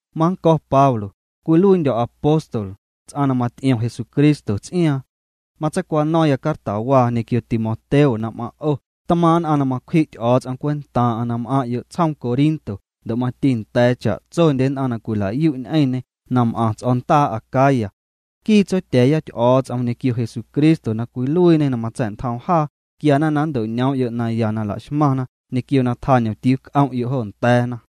Mannco̱ Pablo, cwiluiindyo̱ apóstol, ts'aⁿ na maty'iom Jesucristo ts'iaaⁿ. Matseicwano̱ⁿya cartawaa ñequio Timoteo na m'aⁿ' o' tmaaⁿ' nn'aⁿ na macwji' Ty'o̱o̱ts'om cwentaaⁿ'aⁿ na m'aⁿ'yo' tsjoom Corinto ndo' mati nda̱a̱ cha'tsondye nn'aⁿ na cwilayu' ñ'eⁿñê na m'aⁿ ts'o̱ndaa Acaya. Nquii Tsotya̱a̱ya Ty'o̱o̱ts'om ñequio Jesucristo na cwiluiiñê na matsa̱'ntjoom jaa, quiana na nnto'ñoom'yo' naya na laxmaⁿna ñequio na tjaañomtiuu c'om'yo' jo nda̱a̱na.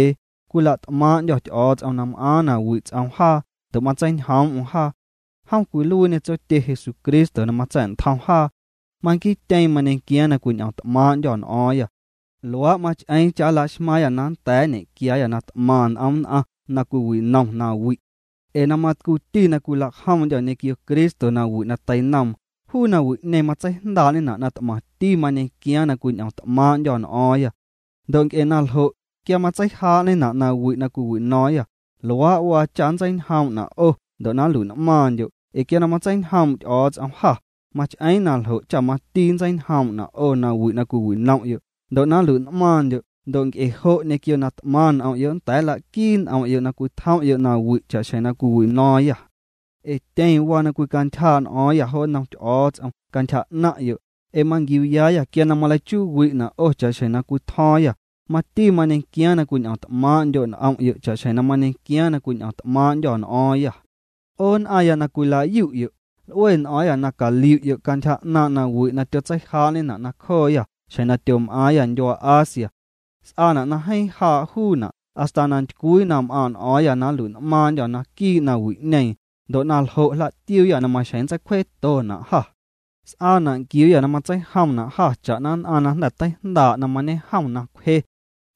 Cwila't'maaⁿ'ndyô̱ Ty'o̱o̱ts'om na m'aaⁿ na wi' ts'oom jaa ndo' na matseiñjoom'm jaa. Jom cwiluiiñê Tsotye Jesucristo na matsa̱'ntjom jaa. Manquiityeeⁿ mañequiaaⁿ na cwiñ'omt'maaⁿ'ndyô̱ n'o̱o̱ⁿyâ nawi' na cwiwino̱o̱ⁿyâ. Luaa' mach'eeⁿ cha' nla'xmaaⁿyâ na nnda̱a̱ nñequiaayâ na t'maⁿ n'om nn'aⁿ na cwiwinom nawi'. Ee na matcuuti na cwilajomndyô̱ ñequio Cristo nawi' na teinoom, juu nawi'ñeeⁿ matseijndaa'ñena' na t'maⁿti mañequiaaⁿ na cwiñ'omt'maaⁿ'ndyô̱ n'o̱o̱ⁿyâ. Ndo' nc'e na ljo', quia matseijaa'ñena' nawi' na cwiwino̱o̱ⁿyâ, luaa' waa cha nntseiñjoom'na' 'o ndo' na nlui'n'maaⁿndyo' ee quia matseiñjoom' Ty'o̱o̱ts'om jâ, mach'eeⁿ na ljo' cha mati nntseiñjoom'na' 'o nawi' na cwiwinom'yo' ndo' na nlui'n'maaⁿndyo' ndo' nc'e jo' ñequio na t'maⁿ n'om'yo' nnda̱a̱ nla'quii n'om'yo' na cwitjom'yo' nawi' cha'xjeⁿ cwiwino̱o̱ⁿyâ. Ee tyeⁿ waa na cwicantyjaa' n'o̱o̱ⁿyâ jo nnom Ty'o̱o̱ts'om cantyja 'naⁿ'yo', ee manquiuyaayâ quia maleichuuwi'na' 'o cha'xjeⁿ na cwitjo̱o̱ⁿyâ, mati mañequiaaⁿ na cwiñ'om't'maaⁿ'ndyo' n'om'yo' cha'xjeⁿ na mañequiaaⁿ na cwiñ'o̱ⁿt'maaⁿ'ndyô̱ n'o̱o̱ⁿyâ. 'O nn'aⁿya na cwila'yu'yo', l'ue n'o̱o̱ⁿyâ na caliu'yo' cantyja 'naaⁿ' nawi' na tyotseijaa'ñena' nacjooyâ xjeⁿ na tyom'aaⁿyâ ndyuaa Asia. S'aana' na jeeⁿ jaa' juuna' hasta na ntycwii na m'aaⁿ' n'o̱o̱ⁿyâ na nlui'n'maaⁿndyô̱ naquii' nawi'ñeeⁿ, ndo' na ljo' jla'tiuuyâ maxjeⁿ nntseicwjetona' jâ. S'aana' nquiuuyâ na matseijomna' jâ cha'na nn'aⁿ na jnda̱ teijndaa' na mañejom na cwje.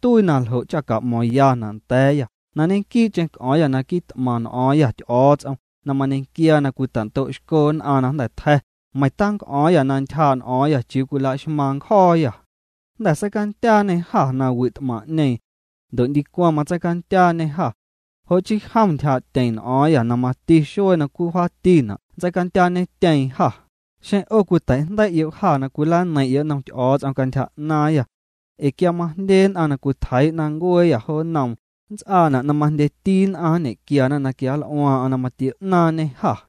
Tuii na ljo' cha ca'mo̱ⁿyana' nda̱a̱yâ na ñequii'cheⁿ c'o̱o̱ⁿyâ na quit'maⁿ n'o̱o̱ⁿyâ Ty'o̱o̱ts'om na mañequiaa na cwitando'xco nn'aⁿ na jnda̱ tja̱, meiⁿ tanc'o̱o̱ⁿyâ na ntyjaa' n'o̱o̱ⁿyâ chiuu cwilaxmaaⁿ nncjo̱o̱yâ. Jnda̱ seicandyaañê jâ nawi' t'maⁿ'ñeeⁿ. Ndo' ndicwaⁿ matseicandyaañê jâ. Jo' chii jom ntyjaa'tyeⁿ n'o̱o̱ⁿyâ na mati xuee na wjaatina' nntseicandyaañetyeeⁿ jâ, xeⁿ 'o cwiteijndei'yo' jâ na cwilaneiⁿ'yo' nnoom cantyja 'naaⁿyâ. Ee quia majndye nn'aⁿ cwitjeii'na ncueeyâ jo nnoom, nnts'aana' na majndyendyeti nn'aⁿ nñequiana na quianl'uaaⁿ'aⁿ na matio'naaⁿñê jâ.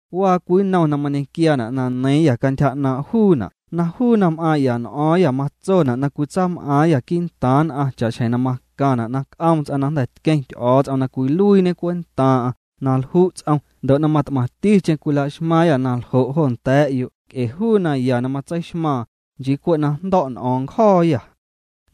Waa cwii nnom na mañequiaana' na neiiⁿyâ cantyja 'naaⁿ' juuna' na juu na m'aaⁿ'ya n'o̱o̱ⁿyâ matsona' na cwitsaam'aaⁿyâ quii'ntaaⁿ nn'aⁿ cha'xjeⁿ macaⁿna' na c'oom ts'aⁿ na jnda̱ tqueⁿ Ty'o̱o̱ts'om na cwiluiiñe cwentaaⁿ'aⁿ na lju' ts'om ndo' mat'maⁿticheⁿ cwilaxmaaⁿyâ na ljo' jo nda̱a̱ 'yo' nc'e juu naya na matseixmaaⁿ, nchii cwe' na jndo̱' n'o̱o̱ⁿ ncjo̱o̱yâ.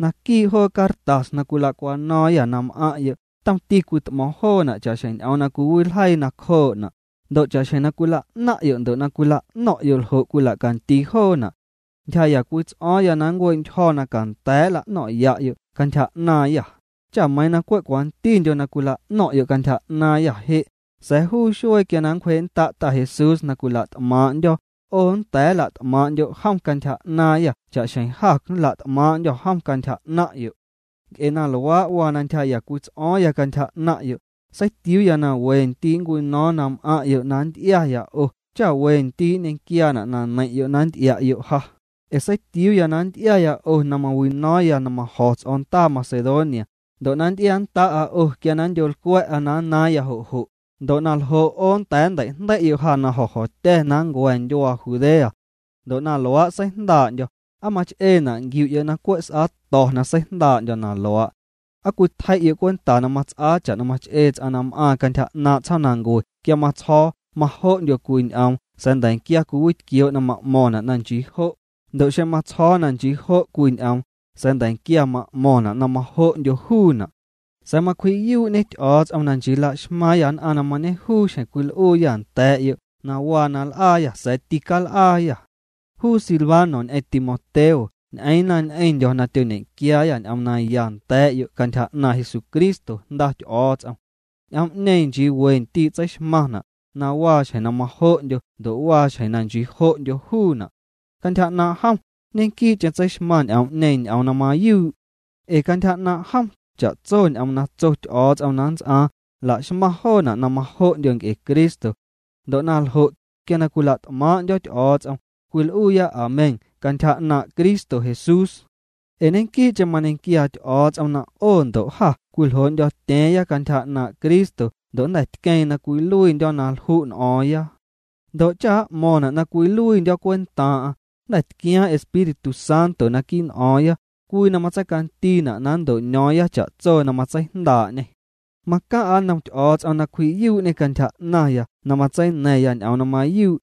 Naquii' joo cartas na cwila'cwano̱o̱ⁿyâ na m'aⁿ'yo' tomti cwit'mo̱o̱ⁿ joona' cha'xjeⁿ ñ'oom na cwiwiljeii nacjoona', ndo' cha'xjeⁿ na cwila'naⁿ'yo' ndo' na cwila'no̱ⁿ'yo' ljo' cwila'candii joona'. Ntyjaa'ya cwii ts'o̱o̱ⁿya na nncue'ntyjo̱ na canda̱a̱' nla'no̱ⁿ'ya'yo' cantyja 'naaⁿyâ, cha meiiⁿ na cwe' cwantindyo cwila'no̱ⁿ'yo' cantyja 'naaⁿyâ je', sa̱a̱ juu xuee quia na nncwjee'nnda' Ta Jesús na cwila't'maaⁿ'ndyo̱, 'o nnda̱a̱ nla't'maaⁿ'ndyo' jom cantyja 'naaⁿyâ cha'xjeⁿ jâ nla't'maaⁿ'ndyô̱ jom cantyja 'naⁿ'yo'. Nc'e na luaa' waa na ntyjaa'ya cwii ts'o̱o̱ⁿya cantyja 'naⁿ'yo', seitiuuya na wendii' nncwino̱o̱ⁿ na m'aⁿ'yo' na nty'iaya 'o cha we ndii' nñequiaana' na neiⁿ'yo' na nty'ia'yo' ja, ee seitiuuya na nty'iaya 'o na mawino̱o̱ⁿya na majo̱ ts'o̱ndaa Macedonia, ndo' na nty'iannda'a 'o quia na nndyolcwa̱'a na nnaaⁿya jo' jo', ndo' na ljo' 'o nnda̱a̱ nnteijndei'yo' ja na jo̱jo̱tya̱ na nncua̱ ndyuaa Judea. Ndo' na luaa' seijndaa'ndyo̱, ¿aa mach'eena' nquiu'yo' na cwe' na s'aato̱ na seijndaa'ndyo̱ na luaa'? ¿Aa cwitjei'yo' cwenta na mats'aa cha'na mach'ee ts'aⁿ na m'aaⁿ cantyja 'naaⁿ' tsjoomnancue quia matsjo̱o̱ “majo'ndyo” cwii ñ'oom sa̱a̱ nda̱nquia cwiwitquioo' na ma'mo̱ⁿna' na “nchii jo'”, ndo' xeⁿ matsjo̱o̱ na nchii jo' cwii ñ'oom, sa̱a̱ nda̱nquia ma'mo̱ⁿna' na majo'ndyo juuna'? Sa̱a̱ macwji'yuu'ñe Ty'o̱o̱ts'om na nchii la'xmaaⁿyâ nn'aⁿ na mañejuu xjeⁿ cwil'uuyâ nda̱a̱'yo' na waa na l'aayâ sa̱a̱ tical'aayâ. Juu Silvano ñ'eⁿ Timoteo ñ'eeⁿna ñ'eⁿndyo̱ na tyoñequiaayâ ñ'oom naya nda̱a̱'yo' cantyja 'naaⁿ' Jesucristo Jnda Ty'o̱o̱ts'om. Ñ'oom'ñeeⁿ nchii we ndii' tseixmaⁿna', na waa xjeⁿ na majo'ndyo ndo' waa xjeⁿ na nchii jo'ndyo juuna'. Cantyja 'naaⁿ' jom, ñequii'cheⁿ tseixmaⁿ ñ'oom'ñeeⁿ ñ'oom na mayuu'. Ee cantyja 'naaⁿ' jom, cha'tso ñ'oom na tso Ty'o̱o̱ts'om na nnts'aaⁿ, laxmaⁿ joona' na majo'ndyo nc'e Cristo. Ndo' na ljo', quia cwila't'maaⁿ'ndyo̱ Ty'o̱o̱ts'om, cwil'uuya Amén cantyja 'naaⁿ' Cristo Jesús. Ee ñequii'cheⁿ mañequiaa Ty'o̱o̱ts'om na 'o ndo' jâ cwiljoo'ndyo̱tya̱a̱ⁿya cantyja 'naaⁿ' Cristo ndo' jnda̱ tqueeⁿ na cwiluiindyo̱ na lju' n'o̱o̱ⁿya. Ndo' cha m'mo̱ⁿna' na cwiluiindyo̱ cwentaaⁿ'aⁿ, jnda̱ tquiaaⁿ Espíritu Santo quii' n'o̱o̱ⁿya, cwii na matseicandiina' na nnto'ño̱o̱ⁿya cha'tso na matseijndaa'ñê. Macaⁿ'a nnom Ty'o̱o̱ts'om na cwji'yuu'ñê cantyja 'naⁿya na matseina̱ⁿya ñ'oom na mayuu'.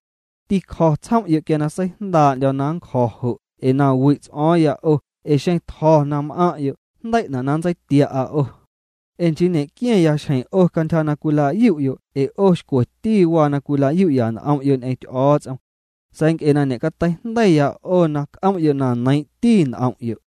Tîcjo̱ tsjom'yo' quia na seijndaa'ndyo̱ na ncjo̱ jo' ee na wi' ts'o̱o̱ⁿya 'o ee xeⁿ tjo̱ na m'aⁿ'yo' jndei'na na nntseitia'a 'o. Ee nchii ñe'qua̱a̱ⁿyâ xjeⁿ 'o cantyja na cwila'yu'yo' ee 'o xcweti waa na cwila'yu'ya n'om'yo' ñ'eⁿ Ty'o̱o̱ts'om. Sa̱a̱ nc'e na ñe'cateijndeiiyâ 'o na c'om'yo' na neiiⁿ'ti n'om'yo'.